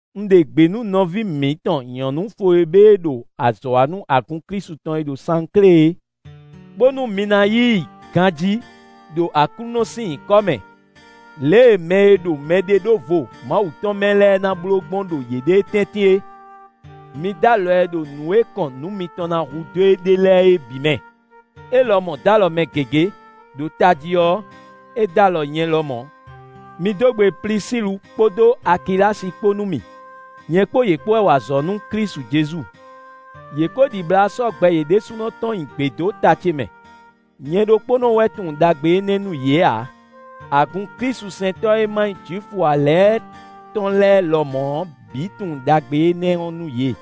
Un ɖe gbě nú nɔví mǐtɔn nyɔ̌nu Fwebée e ɖo azɔ̌ wa nú agun Klísu tɔn e ɖo Sanklé é, bónú mi na yí i ganjí ɖo Aklúnɔ sín nyǐkɔ mɛ, lě e mɛ e ɖo mɛɖeɖóvo Mawu tɔn mɛ lɛ́ɛ ná bló gbɔn ɖo yěɖée tɛ́ntin é; mi d'alɔ ɛ ɖo nǔ e kɔn nǔ mitɔn ná hudó e ɖe lɛ́ɛ é bǐ mɛ. É lɔmɔ̌ d'alɔ mɛ gěgé, ɖo tají ɔ́, é d'alɔ nyɛ lɔmɔ̌. Mi dó gbe Plisílu kpódó Akilási kpó nú mì; nyɛ kpó yě kpó wɛ wa azɔ̌ nú Klísu Jezu. Yě ko ɖibla sɔ́ gbɛ yě ɖésúnɔ tɔn nyi gbě dó ta ce mɛ; nyɛ ɖokpónɔ wɛ tunwun ɖagbe énɛ́ nú yě ǎ; agun klísusɛntɔ́ e ma nyí Jwifu ǎ lɛ́ɛ tɔn lɛ́ɛ lɔmɔ̌ ɔ́ bǐ tunwun ɖagbe énɛ́ nú yě.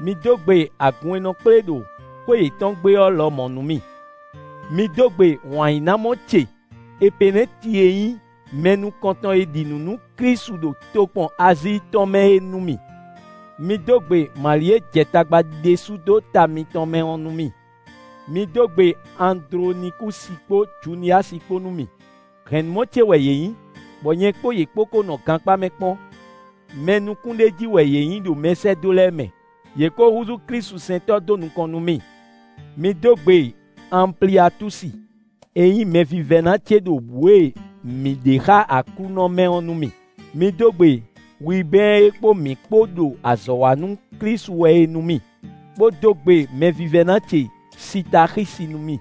Mi dó gbe agun e nɔ kplé ɖo xwé yětɔn gbe ɔ́ lɔmɔ̌ nú mì. Mi dó gbe wǎnyínámɔ ce Epenɛ́ti e nyí mɛ nukɔn tɔn e ɖi nǔ nú Klísu ɖo tokpɔn Azíi tɔn mɛ é nú mì. Mi dó gbe Mali e jɛ tagba ɖésú dó ta mitɔn mɛ ɔ́ nú mì. Mi dó gbe Andlonikúsi kpó Juniyasi kpó nú mì; hɛ̌nnumɔ ce wɛ yě nyí, bɔ nyɛ kpó yě kpó kó nɔ gankpá mɛ kpɔ́n. Mɛ nukúnɖéjí wɛ yě nyí ɖo mɛsɛ́dó lɛ́ɛ mɛ, yě ko húzú klísusɛntɔ́ dó nukɔn nú mì. Mi dó gbe Anpliatúsi e nyí mɛvívɛ́ná ce ɖo bǔ e mǐ ɖe xá Aklúnɔ mɛ ɔ́ nú mì. Mi dó gbe Wibɛ́ɛn e kpó mǐ kpó ɖo azɔ̌ wa nú Klísu wɛ é nú mì; bó dó gbe mɛvívɛ́ná ce Sitaxísi nú mì.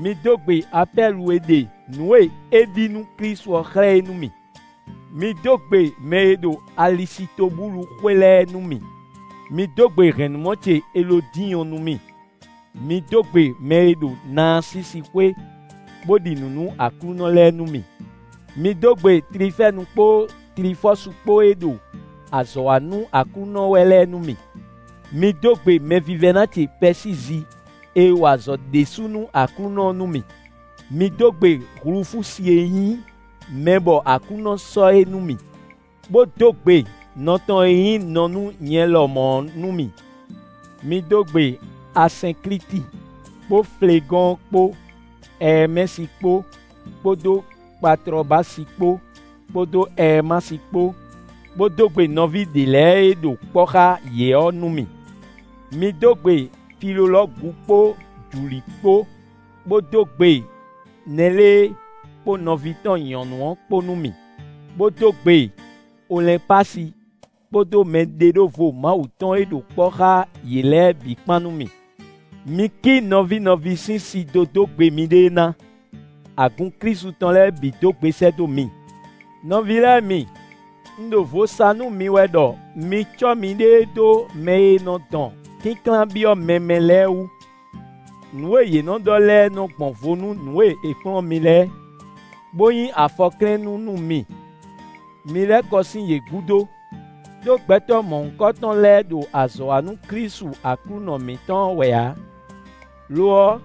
Mi dó gbe Apɛlu e ɖe nǔ e é ɖi nú Klísu ɔ́ xlɛ́ é nú mì. Mi dó gbe mɛ e ɖo Alisitobúlu xwé lɛ́ɛ nú mì. Mi dó gbe hɛ̌nnumɔ ce Elódiɔ́n nú mì. Mi dó gbe mɛ e ɖo Naasísi xwé, bó ɖi nǔ nú Aklúnɔ lɛ́ɛ nú mì. Mi dó gbe Tlifɛ́nu kpó Tlifɔ́su kpó e ɖo azɔ̌ wa nú Aklúnɔ wɛ lɛ́ɛ nú mì. Mi dó gbe mɛvívɛ́ná ce Pɛsízi e wa azɔ̌ ɖésú nú Aklúnɔ ɔ́ nú mì. Mi dó gbe Hlufúsi e nyí mɛ bɔ Aklúnɔ sɔ́ é nú mì, bó dó gbe nɔ tɔn e nyí nɔ nú nyɛ lɔmɔ̌ ɔ́ nú mì. Mi dó gbe Asɛnklíti kpó Flegɔ́ɔn kpó Ɛɛmɛsi kpó, kpódó Patlɔbási kpó, kpódó Ɛɛmasi kpó, bó dó gbe nɔví ɖě lɛ́ɛ e ɖo kpɔ́ xá yě ɔ́ nú mì. Mi dó gbe Filolɔ́gu kpó Juli kpó, bó dó gbe Nɛlée kpó nɔví tɔn nyɔ̌nu ɔ́ kpó nú mì, bó dó gbe Olɛ́npási kpódó mɛɖeɖóvo Mawu tɔn e ɖo kpɔ́ xá yě lɛ́ɛ bǐ kpán nú mì. Mi ki nɔví nɔví sín si dó dó gbe miɖée ná; agun Klísu tɔn lɛ́ɛ bǐ dó gbe sɛ́ dó mi. Nɔví lɛ́ɛ mi, un ɖo vo sa nú mi wɛ ɖɔ mi cɔ́ miɖée dó mɛ e nɔ dɔn kínklán byɔ́ mɛ mɛ lɛ́ɛ wú. Nǔ e yě nɔ ɖɔ lɛ́ɛ nɔ gbɔn vo nú nǔ e è kplɔ́n mi lɛ́ɛ, bó nyí afɔklɛ́nnú nú mi; mi lɛ́ kɔ sín yě gúdo. Đó gbɛtɔ́ mɔ̌hunkɔtɔn lɛ́ɛ ɖo azɔ̌ wa nú Klísu Aklúnɔ mǐtɔn ɔ́ wɛ ǎ; lo ɔ́,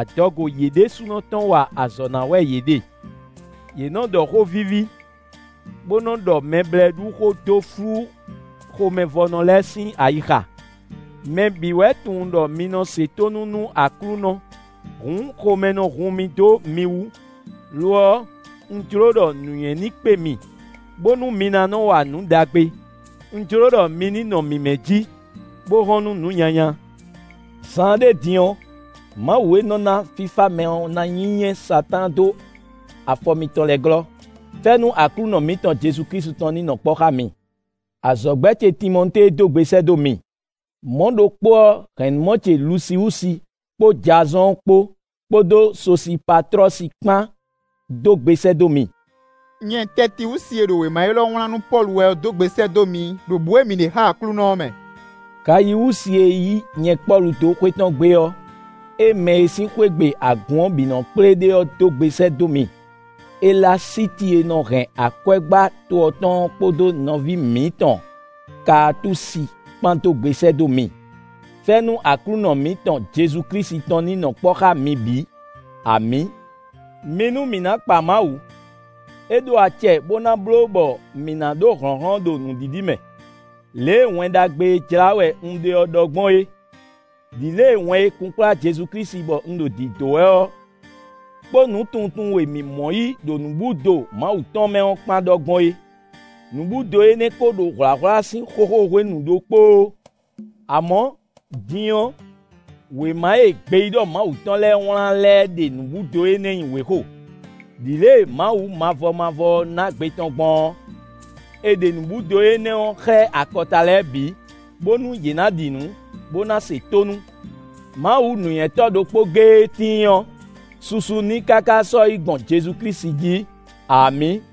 adɔgo yě ɖésúnɔ tɔn wa azɔ̌ ná wɛ yě ɖe. Yě nɔ ɖɔ xó víví, bó nɔ ɖɔ mɛblɛ́ɖuxó dó flú xomɛvɔ́nɔ lɛ́ɛ sín ayixa. Mɛ bǐ wɛ tunwun ɖɔ mi nɔ se tónú nú Aklúnɔ; hǔn xomɛ nɔ hun mì dó mi wú; lo ɔ́, un jló ɖɔ nǔnywɛ́ ní kpé mi, bónú mi ná nɔ wa nǔ ɖagbe; un jló ɖɔ mi ní nɔ mǐmɛ́ jí, bó hɔn nú nǔ nyanya. Zaanɖé din ɔ́, Mawu e nɔ ná fífá mɛ ɔ́ ná nyínyɛ́ Satáan dó afɔ mitɔn lɛ́ɛ glɔ́. Fɛ́nú Aklúnɔ mǐtɔn Jezu tɔn ní nɔ kpɔ́ xá mi. Azɔ̌gbɛ́ ce Timɔtée dó gbe sɛ́ dó mi; mɔ̌ ɖokpó ɔ́, hɛ̌nnumɔ ce Lusiwúsi kpó Jazɔ́ɔn kpó, kpódó Sosipatlɔ́si kpán dó gbe sɛ́ dó mi. Nyɛ Tɛtiwúsi e ɖo wěma élɔ́ wlán nú Pɔ́lu wɛ ɔ́ dó gbe sɛ́ dó mi ɖo bǔ e mǐ ɖe xá Aklúnɔ ɔ́ mɛ. Gayiwúsi e yí nyɛ Pɔ́lu dó xwé tɔn gbe ɔ́, é mɛ e sín xwé gbe agun ɔ́ bǐ nɔ́ kplé ɖe ɔ́ dó gbe sɛ́ dó mi. Elasíti e nɔ hɛn akwɛ́gbá to ɔ́ tɔn ɔ́ kpódó nɔví mǐtɔn Kaatúsi kpán dó gbe sɛ́ dó mi. [ Fɛ́nú Aklúnɔ mǐtɔn Jezu Klísu tɔn ní nɔ kpɔ́ xá mi bǐ. Amǐ!] Mi nú mǐ ná kpa Mawu! É ɖó acɛ bó ná bló bɔ mǐ ná ɖó hlɔ̌nhlɔ́n ɖo nǔɖiɖi mɛ, lě e Wɛn Ɖagbe e jlá wɛ un ɖe ɔ́ ɖɔ gbɔn é, ɖi lě e wɛn e kunkplá Jezu Klísu bɔ un ɖo dǐdó wɛ ɔ́, kpo nǔtunwuntunwun e mǐ mɔ yí ɖo nǔbúdo Mawu tɔn mɛ ɔ́ kpán ɖɔ gbɔn é. Nǔbúdo énɛ́ ko ɖo hwlǎhwlá sín xóxó hwenu ɖokpóó. Amɔ̌, din ɔ́, wěma e gbeyíɖɔ Mawu tɔn lɛ́ɛ wlán lɛ́ɛ ɖe nǔbúdo énɛ́ nyi wěxo. Đi lě e Mawu Mavɔmavɔ ɔ́ ná gbe tɔn gbɔn ɔ́, è ɖe nǔbúdo énɛ́ ɔ́ xlɛ́ akɔta lɛ́ɛ bǐ, bónú yě ná ɖi nǔ, bó ná se tónú. Mawu nǔnywɛ́tɔ́ ɖokpó géé e tíin ɔ́, susu n'i káká sɔ́yi gbɔn Jezu Klísu jí. Amǐ!